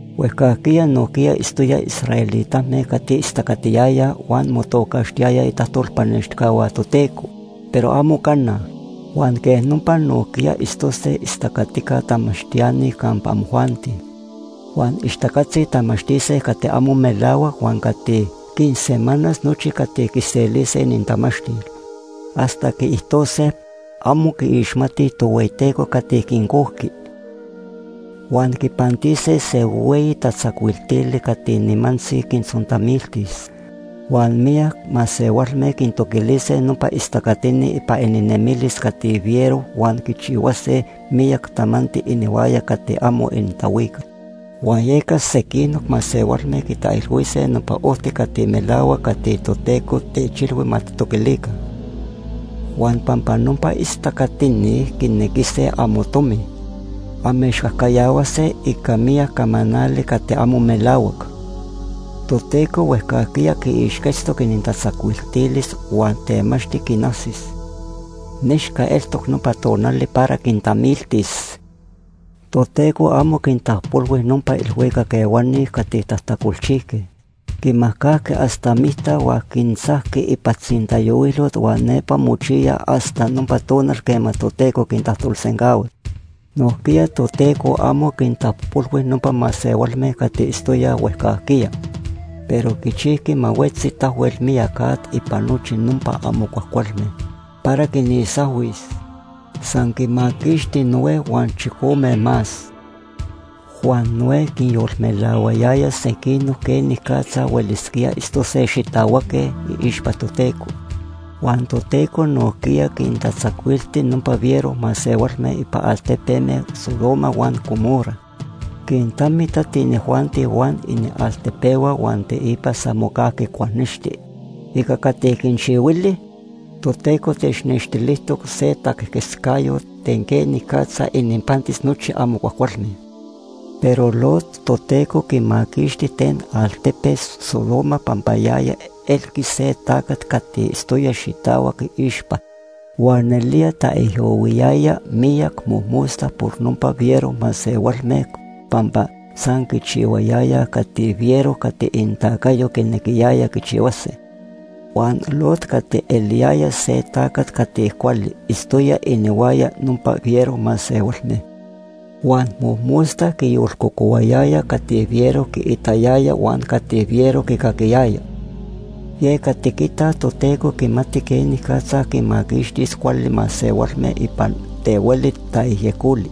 Huejcajquiya nojquiya itztoyaj israelitame cati istacatiyayaj huan motocaxtiyayaj itajtolpanextijcahua Toteco, pero amo cana. Huan quej nopa nojquiya itztose istacatica tamachtiani campa amojuanti. Huan ixtacatzi tamachtise cati amo melahuac huan cati quinsemanas nochi cati quiselise inintamachtil. Hasta quiijtose amo quiixmatij Tohueyiteco cati quincojqui. Huan quipantise se hueyi tatzacuiltili cati nimantzi quintzontamiltis. Huan miyac masehualme quintoquilise nopa istacatini ipan ininemilis cati fiero huan quichihuase miyac tamanti inihuaya cati amo inintahuical. Huan yeca sequinoc masehualme quitaijilhuise nopa ojti cati melahuac cati Toteco techilhui ma tijtoquilica. Huan pampa nopa istacatini quinequise amotomi, amechcajcayahuase ica miyac camanali cati amo melahuac. Toteco huejcajquiya quiixquetztoc inintatzacuiltilis huan temachti quinajsis. Nechca eltoc nopa tonali para quintamiltis. Toteco amo quintapojpolhui nopa ilhuicac ehuani cati tajtacolchijque. Quinmajcajqui hasta micta, huan quintzajqui ipan tzintayohuilot huan nepa mochiyaj hasta nopa tonali quema Toteco quintajtolsencahuas. Nojquiya Toteco amo quintapojpolhui nopa masehualme cati itztoyaj huejcajquiya, pero quichijqui ma huetzi tahuel miyac at ipan nochi nopa amo cuajcualme para quinisahuis. San quinmaquixti Noé huan chicome más. Huan Noé quinyolmelahuayaya sequinoc quenicatza huelisquíaj itztose xitahuac iixpa Toteco. Huan Toteco nojquiya quintatzacuilti nopa fiero masehualme ipan altepeme Sodoma huan Gomorra. Quintamitati inijuanti huan inialtepehua huan teipa san mocajqui cuajnexti. Ica cati quinchihuili, Toteco technextilijtejtoc se taquejquetzcayot ten quenicatza ininpantis nochi amo cuajcualme. Pero Lot Toteco quimaquixti ten altepe Sodoma pampa yaya elqui se tacat cati itztoya xitahuac iixpa. Huan nelía taijyohuiyaya miyac mojmosta por nopa fiero masehualme pampa san quichihuayayaj cati fiero cati inintacayo quinequiyayaj quichihuase. Huan Lot cati eliyaya se tacat cati cuali itztoya inihuaya nopa fiero masehualme, huan mojmosta quiyolcocohuayaya cati fiero quiitayaya huan cati fiero quicaquiyaya. Yeca tiquitaj Toteco quimati quenicatza quinmaquixtis cuali masehualme ipan ten hueli tayejyecoli.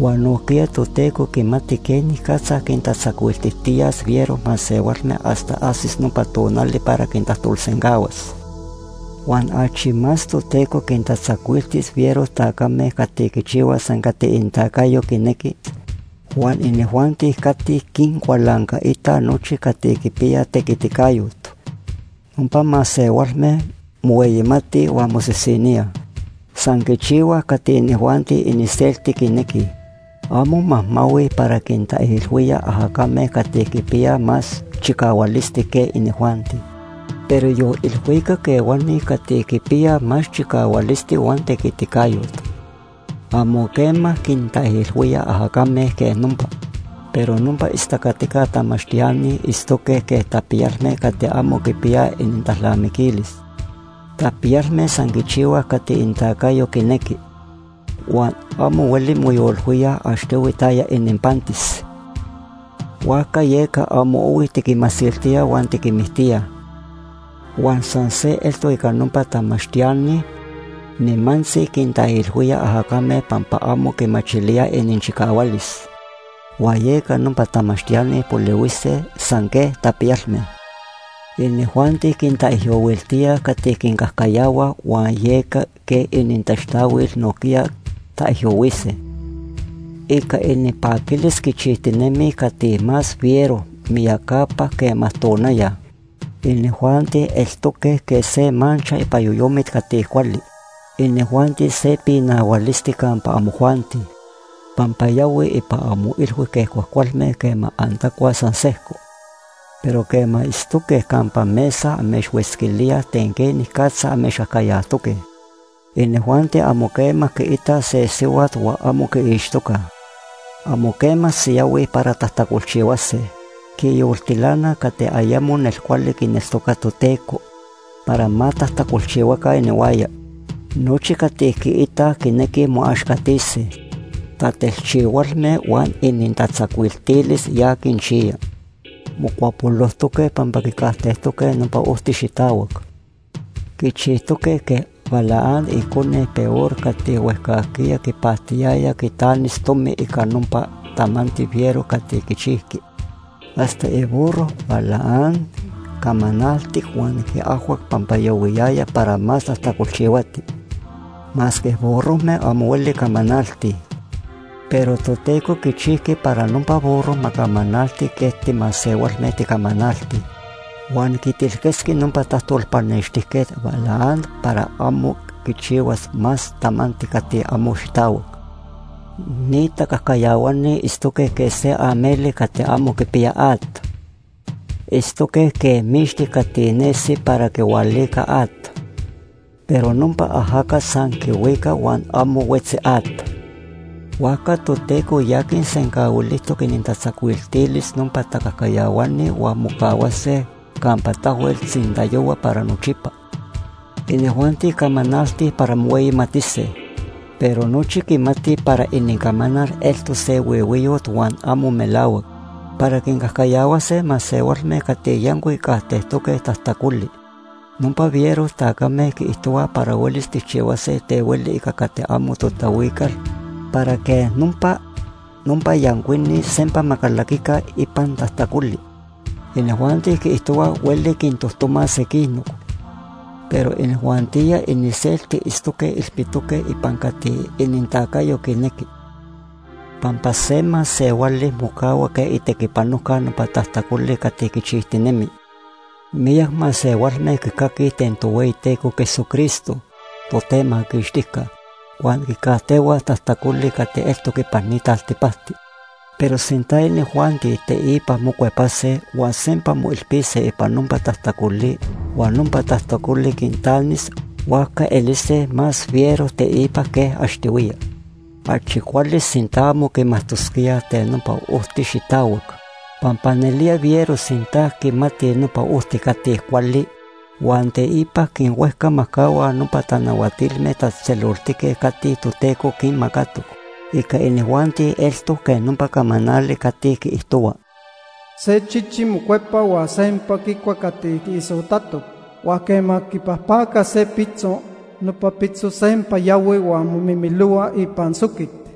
Huan nojquiya Toteco quimati quenicatza quintatzacuiltijtiyas fiero masehualme hasta ajsis nopa tonal para quintajtolsencahuas. Huan achi más Toteco quintatzacuiltis fiero tacame cati quichihuaj san cati inintacayo quinequi huan inijuanti cati quincualancaitaj nochi cati quipiyaj tequiticayot. Nopa masehualme mohueyimatij huan mosisiníaj. San quichihuaj cati inijuanti iniselti quinequij. Amo majmahuij para quintaijilhuíaj ajacame cati quipiyaj más chicahualisti que inijuanti. Pero yon ilhuicac ehuani cati quipiyaj más chicahualisti huan tequiticayot, amo quema quintaijilhuíaj ajacame quej nopa. Pero nopa istacatica tamachtiani itztoque quej tapiyalme cati amo quipiyaj inintalnamiquilis. Tapiyalme san quichihuaj cati inintacayo quinequi, huan amo hueli moyolilhuíaj achtohui taya ininpantis, huajca yeca amo ohui tiquinmasiltíaj huan tiquinmictíaj. Huan san se eltoc ica nopa tamachtiani, nimantzi quintaijilhuíaj ajacame pampa amo quimachilíaj ininchicahualis. Huan yeca nopa tamachtiani polihuise san quej tapiyalme. Inijuanti quintaijyohuiltíaj cati quincajcayahuaj, huan yeca quej inintaxtahuil nojquiya taijyohuise. Ica ininpaquilis quichijtinemij cati más fiero miyacapa quema tonaya. Inijuanti eltoque quej se mancha ipan yoyomit cati cuali. Inijuanti se pinahualisti campa amojuanti, pampa yahuij ipan amoilhui quej cuajcualme quema antacuaj san sejco, pero quema itztoque campa mesa, amechhuetzquilíaj ten quenicatza amechcajcayajtoque. Inijuanti amo quema quiitaj se sihuat huan amo quiixtocaj. Amo quema siyahuij para tajtacolchihuase. Quinyoltilanaj cati ayemo nelcuali quineltocaj Toteco para ma tajtacolchihuaca inihuaya. Nochi cati quiitaj, quinequij moaxcatise. Tatelchihualme huan inintatzacuiltilis ya quinchiya. Mocuapolojtoque pampa quicajtejtoque nopa ojti xitahuac. Quichijtoque quej Balaam icone Beor cati huejcajquiya quipactiyaya quitanis tomi ica nopa tamanti fiero cati quichijqui. Hasta iburro Balaam camanaltic huan quiajhuac pampa yahuiyaya para más tajtacolchihuati, masque burrojme amo hueli camanaltij. Pero Toteco quichijqui para nopa burro ma camanalti quej timasehualme ticamanaltij, huan quitilquetzqui nopa tajtolpanextijquet Balaam para amo quichihuas más tamanti cati amo xitahuac. Ni tacajcayahuani itztoque quej se ameli cati amo quipiya at. Itztoque quej mixti cati nesi para quihualica at, pero nopa ajacat san quihuica huan amo huetzi at. Huajca Toteco ya quinsencahuilijtoc inintatzacuiltilis nopa tacajcayahuani huan mocahuase campa tahuel tzintayohua para nochipa. Inijuanti camanaltij para mohueyimatise, pero nochi quimatij para inincamanal eltoc se huihuiyot huan amo melahuac. Para quincajcayahuase masehualme cati yancuic quicajtejtoque tajtacoli, nopa fiero tacame quiijtohuaj para huelis tijchihuase ten hueli ica cati amo totahuical para quej nopa, nopa yancuini sempa ma calaquica ipan tajtacoli. Inijuanti quiijtohuaj hueli quintojtomaj sequinoc, pero inijuantijya iniselti itztoque ilpitoque ipan cati inintacayo quinequi, pampa se masehuali mocahua quej itequipanojca nopa tajtacoli cati quichijtinemi. Miyac masehualme quicaquij ten Tohueyiteco Jesucristo, Totemaquixtijca, huan quicajtehuaj tajtacoli cati eltoc ipan ni taltipacti. Pero sinta inijuanti teipa mocuepase huan sempa moilpise ipan nopa tajtacoli huan nopa tajtacoli quintanis, huajca elise más fiero teipa que achtohuiya. Achi cuali sinta amo quimajtosquíaj ten nopa ojti xitahuac, pampa nelía fiero sinta quimatij nopa ojti cati cuali huan teipa quinhuejcamajcahuaj nopa tanahuatilme tatzejtzeloltique cati Toteco quinmacatoc. Ica inijuanti eltoc quej nopa camanali cati quiijtohua: “Se chichi mocuepa huan sempa quicua cati quiisotatoc. Huan quema quipajpacaj se pitzo, nopa pitzo sempa yahui huan momimilohua ipan soquit.”